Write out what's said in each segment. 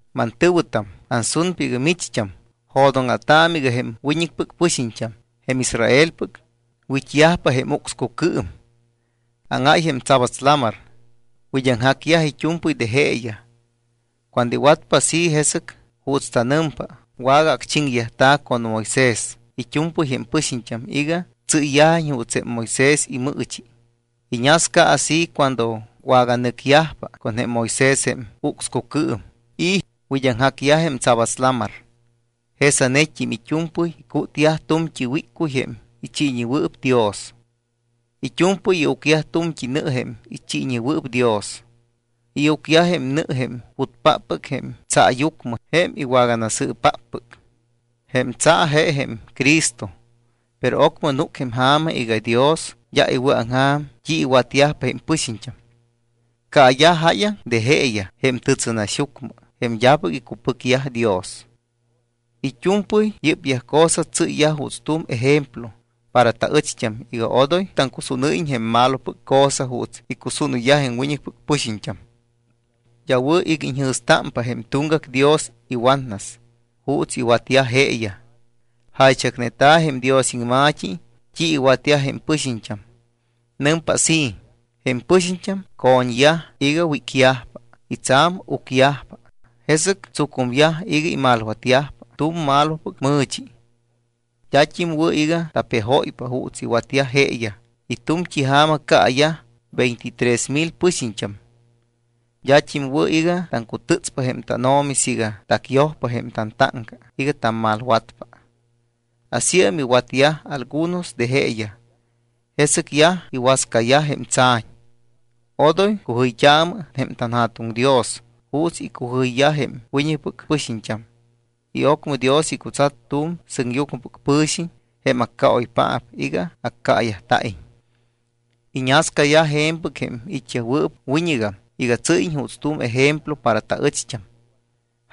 Mantɨ̱wɨtam, ansunpa iga micht́am jo̱dóŋa̱taamɨ iga jém wiñɨcpɨc pɨxiñt́am, jém Israelpɨc, wit́yajpa jém ucscucɨɨm. Áŋáy jém Tsabats Lamar, wid́aŋjacyaj it́u̱mpɨy de jeeyaj. Cuando iwatpa así, jesɨc juuts tanɨmpa wagaacchiŋyajta̱ con Moisés it́u̱mpɨy jém pɨxiñt́am iga tsɨ́yyajiñ juuts jém Moisés imɨɨchi. Iñasca así cuando waganɨcyajpa con jém Moisés jém ucscucɨɨm y wid́aŋjacyaj jém Tsabats Lamar. Jesanet́im it́u̱mpɨy icútyaj tu̱mt́i wíccuy jém ichiiñewɨɨp Dios. It́u̱mpɨy iucyaj tu̱mt́i nɨ jém ichiiñewɨɨp Dios. Iucyaj jém nɨ jém putpáppɨc jém tsaayucmɨ jém iwagasɨɨpáppɨc. Jém tsa je jém Cristo. Pero ocmɨ núc jém ja̱ma iga Dios d́a iwɨ̱aŋja̱m t́i iwatyajpa jém pɨxiñt́am. Caayaj jáyaŋ de jeeyaj jém tɨtsɨnaxyucmɨ jém d́apɨc icupɨcyaj Dios. It́u̱mpɨy yɨ́pyaj cosa tsɨ́yyaj juuts tu̱m ejemplo para taɨcht́am iga odoy taŋcusúnɨ́yiñ jém malopɨc cosa juuts icusúnɨyyaj jém wiñɨcpɨc pɨxiñt́am. D́a wɨ̱ iga iñjɨ̱stámpa jém tuŋgac dios iwatnas juuts iwatyaj jeeyaj. Jaychacneta̱ jém Dios iŋma̱t́i t́i iwatyaj jém pɨxiñt́am. Nɨmpa así: “Jém pɨxiñt́am co̱ñyaj iga wícyajpa y tsa̱m ucyajpa. Jesɨc tsucumyaj iga imalwatyajpa tu̱m malopɨc mɨ̱chi.” D́at́im wɨ̱ iga tapejóypa juuts iwatyaj jeeyaj y tu̱mt́i ja̱ma caayaj veintitrés mil pɨxiñt́am. D́at́im wɨ̱ iga taŋcutɨtspa jém tánO̱mi siiga tacyojpa jém tantáŋca iga tammalwatpa. Asíam iwatyaj algunos de jeeyaj. Jesɨc yaj iwascayaj jém tsa̱ñ. Odoy cujɨyt́aamɨ jém tanJa̱tuŋ Dios juuts icujɨyyaj jém wiñɨcpɨc pɨxiñt́am y ocmɨ Dios icutsat tu̱m sɨŋyucmɨpɨc pɨ̱xiñ, jém accaoypaap, iga accaayajta̱iñ. Iñascayaj je̱mpɨc jém it́yajwɨɨp wiñɨgam iga tsɨ́yiñ juuts tu̱m ejemplo para taɨcht́am.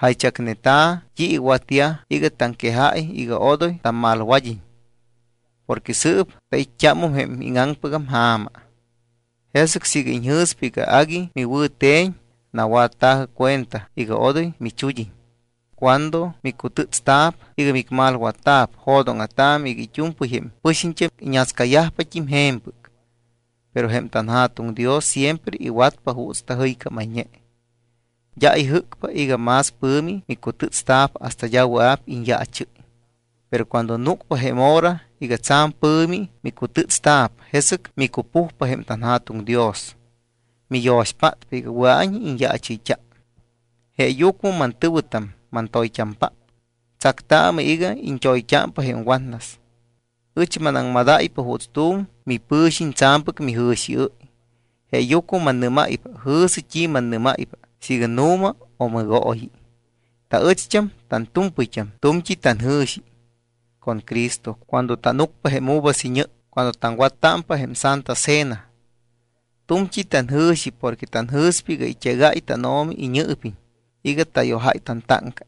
Jaychacneta̱ t́i iwatyaj iga taŋquejáy iga odoy tammalwad́iñ porque sɨɨp tait́t́ámum jém íŋaŋpɨgam ja̱ma. Jesɨc siiga iñjɨ̱spa iga agui miwɨ̱te̱ñ, nawatta̱jɨ cuenta iga odoy michud́iñ. Cuando micutɨ́tsta̱p iga micmalwatta̱p, jo̱dóŋa̱taamɨ iga it́u̱mpɨy jém pɨxiñt́am iñascayajpat́im je̱mpɨc. Pero jém tanJa̱tuŋ Dios siempre iwatpa juuts tajɨycámayñe. D́a ijɨ́cpa iga más pɨ̱mi micutɨ́tsta̱p hasta d́a wɨa̱p iñyaachɨ́y. Pero cuando núcpa jém hora iga tsa̱m pɨ̱mi micutɨ́tsta̱p, jesɨc micupujpa jém tanJa̱tuŋ Dios. Miyo̱xpátpa iga wɨa̱iñ iñyaachɨyt́a. Jeeyucmɨ mantɨ̱wɨtam mantoyt́ampáppɨc, tsactaamɨ iga iñt́oyt́ámpa jém watnas. Ɨch manaŋmadáypa juuts tu̱m mipɨ̱xiñ tsa̱mpɨc mijɨ̱xiɨ́y, jeeyucmɨ mannɨ́máypa, jɨ̱sɨ t́i mannɨ́máypa siiga nu̱ma o mɨgooyi. Taɨcht́am tantu̱mpɨyt́am tu̱mt́i tanjɨ̱xi con Cristo cuando tánucpa jém uvas iñɨ cuando taŋwattámpa jém Santa Cena. Tu̱mt́i tanjɨ̱xi porque tanjɨ̱spa iga it́egáy tánO̱mi iñɨɨpiñ iga tayojáy tantáŋca.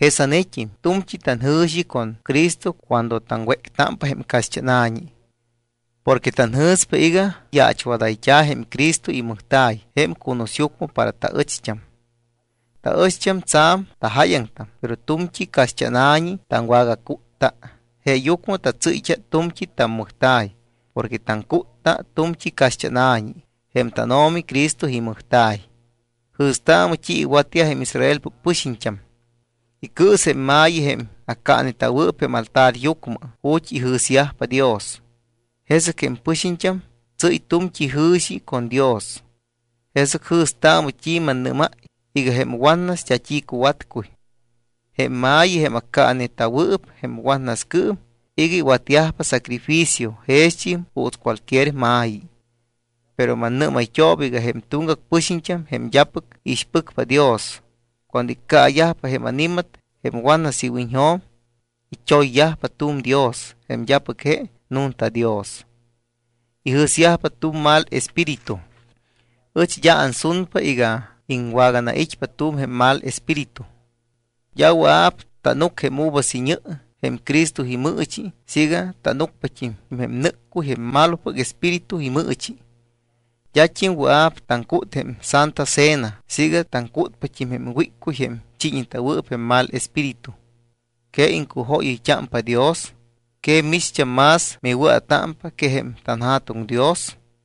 Jesanet́im tu̱mt́i tanjɨ̱xi con Cristo cuando taŋwéctámpa jém caxt́ána̱ñi porque tanjɨ̱spa iga yaachwadayt́a̱ jém Cristo imɨjta̱y jém cunusyucmɨ para taɨcht́am. Taɨcht́am tsa̱m tajáyaŋtam, pero tu̱mt́i caxt́ána̱ñi taŋwagacútta. Jeeyucmɨ tatsɨ́ypa tu̱mt́i tammɨjta̱y porque taŋcútta tu̱mt́i caxt́ána̱ñi, jém tánO̱mi Cristo imɨjta̱y. Jɨ̱staamɨ t́i iwatyaj jém Israelpɨc pɨxiñt́am. Icɨɨs jém ma̱yi jém accaaneta̱wɨɨp jém altaryucmɨ ju̱t́ ijɨ̱syajpa Dios. Jesɨc jém pɨxiñt́am tsɨ́y tu̱mt́i jɨ̱xi con Dios. Jesɨc jɨ̱staamɨ t́i mannɨ́máy iga jém watnas d́a t́i cuwatcuy. Jém ma̱yi jém accaaneta̱wɨɨp jém watnascɨɨm iga iwatyajpa sacrificio, jext́im juuts cualquier ma̱yi. Pero mannɨ́mayt́ooba iga jém tuŋgac pɨxiñt́am, jém d́apɨc iixpɨcpa Dios, cuando iccaayajpa jém ani̱mat jém watnas iwiñjo̱m, it́oyyajpa tu̱m dios jém d́apɨc je nunta Dios. Ijɨ̱syajpa tu̱m mal espíritu. Ɨch d́a ansunpa iga iŋwaganait́pa tu̱m jém mal espíritu. D́a wɨa̱p tánuc jém uvas iñɨ jém Cristo imɨɨchi siiga tánucpat́im jém nɨ́ccuy jém malopɨc espíritu imɨɨchi. D́at́im wɨa̱p taŋcút jém Santa Cena siiga taŋcútpat́im jém wíccuy jém chiiñeta̱wɨɨp jém mal espíritu. ¿Que iŋcujóyɨyt́ámpa Dios? ¿Que micht́am más miwɨa̱támpa que jém tanJa̱tuŋ Dios?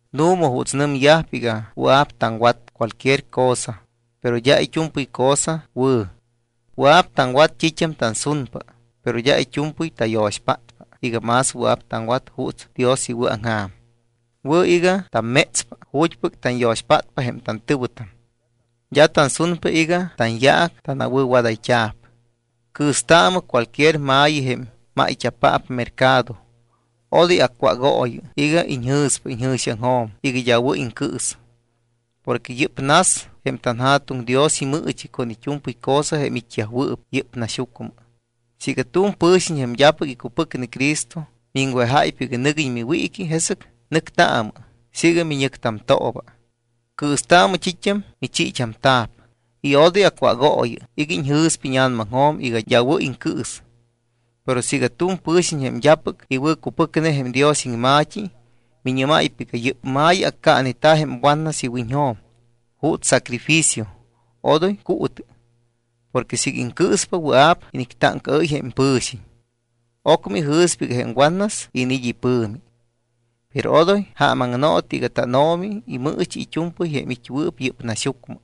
Nu̱ma juuts nɨmyajpa iga wɨa̱p taŋwat cualquier cosa, pero d́a it́u̱mpɨy cosa wɨ̱. Wɨa̱p taŋwat t́it́am tansunpa, pero d́a it́u̱mpɨy tayo̱xpátpa iga más wɨa̱p taŋwat juuts Dios iwɨ̱aŋja̱m. Wɨ̱ iga tammétspa ju̱t́pɨc tanyo̱xpátpa jém tantɨ̱wɨtam. D́a tansunpa iga tanyaac tanawɨ̱wadayt́a̱p. Cɨɨstaamɨ cualquier ma̱yi jém máyt́a̱paap mercado. Odoy acwágooyɨ iga iñjɨ̱spa iñjɨ̱xiaŋjo̱m iga d́a wɨ̱ iŋcɨɨs. Porque yɨ́p nas jém tanJa̱tuŋ Dios imɨɨchi con it́u̱mpɨy cosa jém it́yajwɨɨp yɨ́p naxyucmɨ. Siiga tu̱m pɨ̱xiñ jém d́apɨc icupɨcne Cristo miŋwejáypa iga nɨguiñ miwiiqui, jesɨc nɨctaamɨ siiga miñɨctamtooba. Cɨɨstaamɨ t́it́am michiit́amta̱p y odoy acwágooyɨ iga iñjɨ̱spa íña̱namaŋjo̱m iga d́a wɨ̱ iŋcɨɨs. Pero siiga tu̱m pɨ̱xiñ, jém d́apɨc iwɨ̱cupɨcne jém Dios iŋma̱t́i, miñɨ́máypa iga: “Yɨ́p ma̱yi accaaneta̱ jém watnas iwiñjo̱m juuts sacrificio”, odoy cuutɨ. Porque siiga iŋcɨɨspa, wɨa̱p inictáŋcaɨ́y jém pɨ̱xiñ. Ocmɨ ijɨ̱spa iga jém watnas iniit́ ipɨ̱mi. Pero odoy jaamaŋno̱tɨ iga tánO̱mi imɨɨchi it́u̱mpɨy jém it́wɨɨp yɨ́p naxyucmɨ.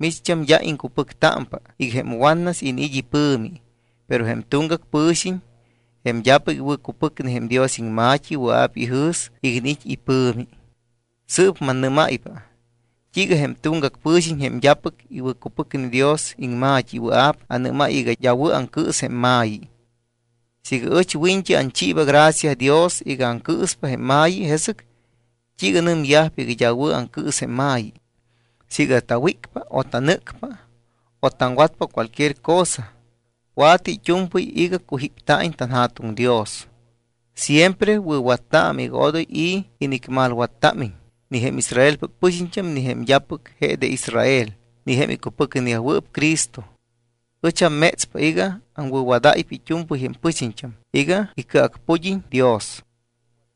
Micht́am d́a iŋcupɨctámpa iga jém watnas iniit́ ipɨ̱mi, pero jém tuŋgac pɨ̱xiñ, jém d́apɨc iwɨ̱cupɨcne jém Dios iŋma̱t́i, wɨa̱p ijɨ̱s iga iniit́ ipɨ̱mi. Sɨɨp mannɨ́máypa t́iiga jém tuŋgac pɨ̱xiñ, jém d́apɨc iwɨ̱cupɨcne Dios iŋma̱t́i, wɨa̱p anɨ́máy iga d́a wɨ̱ aŋcɨɨs jém ma̱yi. Siiga ɨch wiñt́i anchiiba gracia Dios iga aŋcɨɨspa jém ma̱yi, ¿jesɨc t́iiga nɨmyajpa iga d́a wɨ̱ aŋcɨɨs jém ma̱yi? Siiga tawícpa o tanɨ́cpa o taŋwatpa cualquier cosa, wa̱tɨ it́u̱mpɨy iga cujípta̱iñ tanJa̱tuŋ Dios. Siempre wɨ̱wattaamɨ iga odoy i̱ inicmalwattámiñ ni jém Israelpɨc pɨxiñt́am, ni jém d́apɨc je de Israel, ni jém icupɨcneyajwɨɨp Cristo. Ɨch ammétspa iga aŋwɨ̱wadáypa it́u̱mpɨy jém pɨxiñt́am iga icɨacpud́iñ Dios.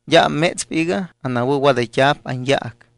D́a ammétspa iga anawɨ̱wadayt́a̱p anyaac.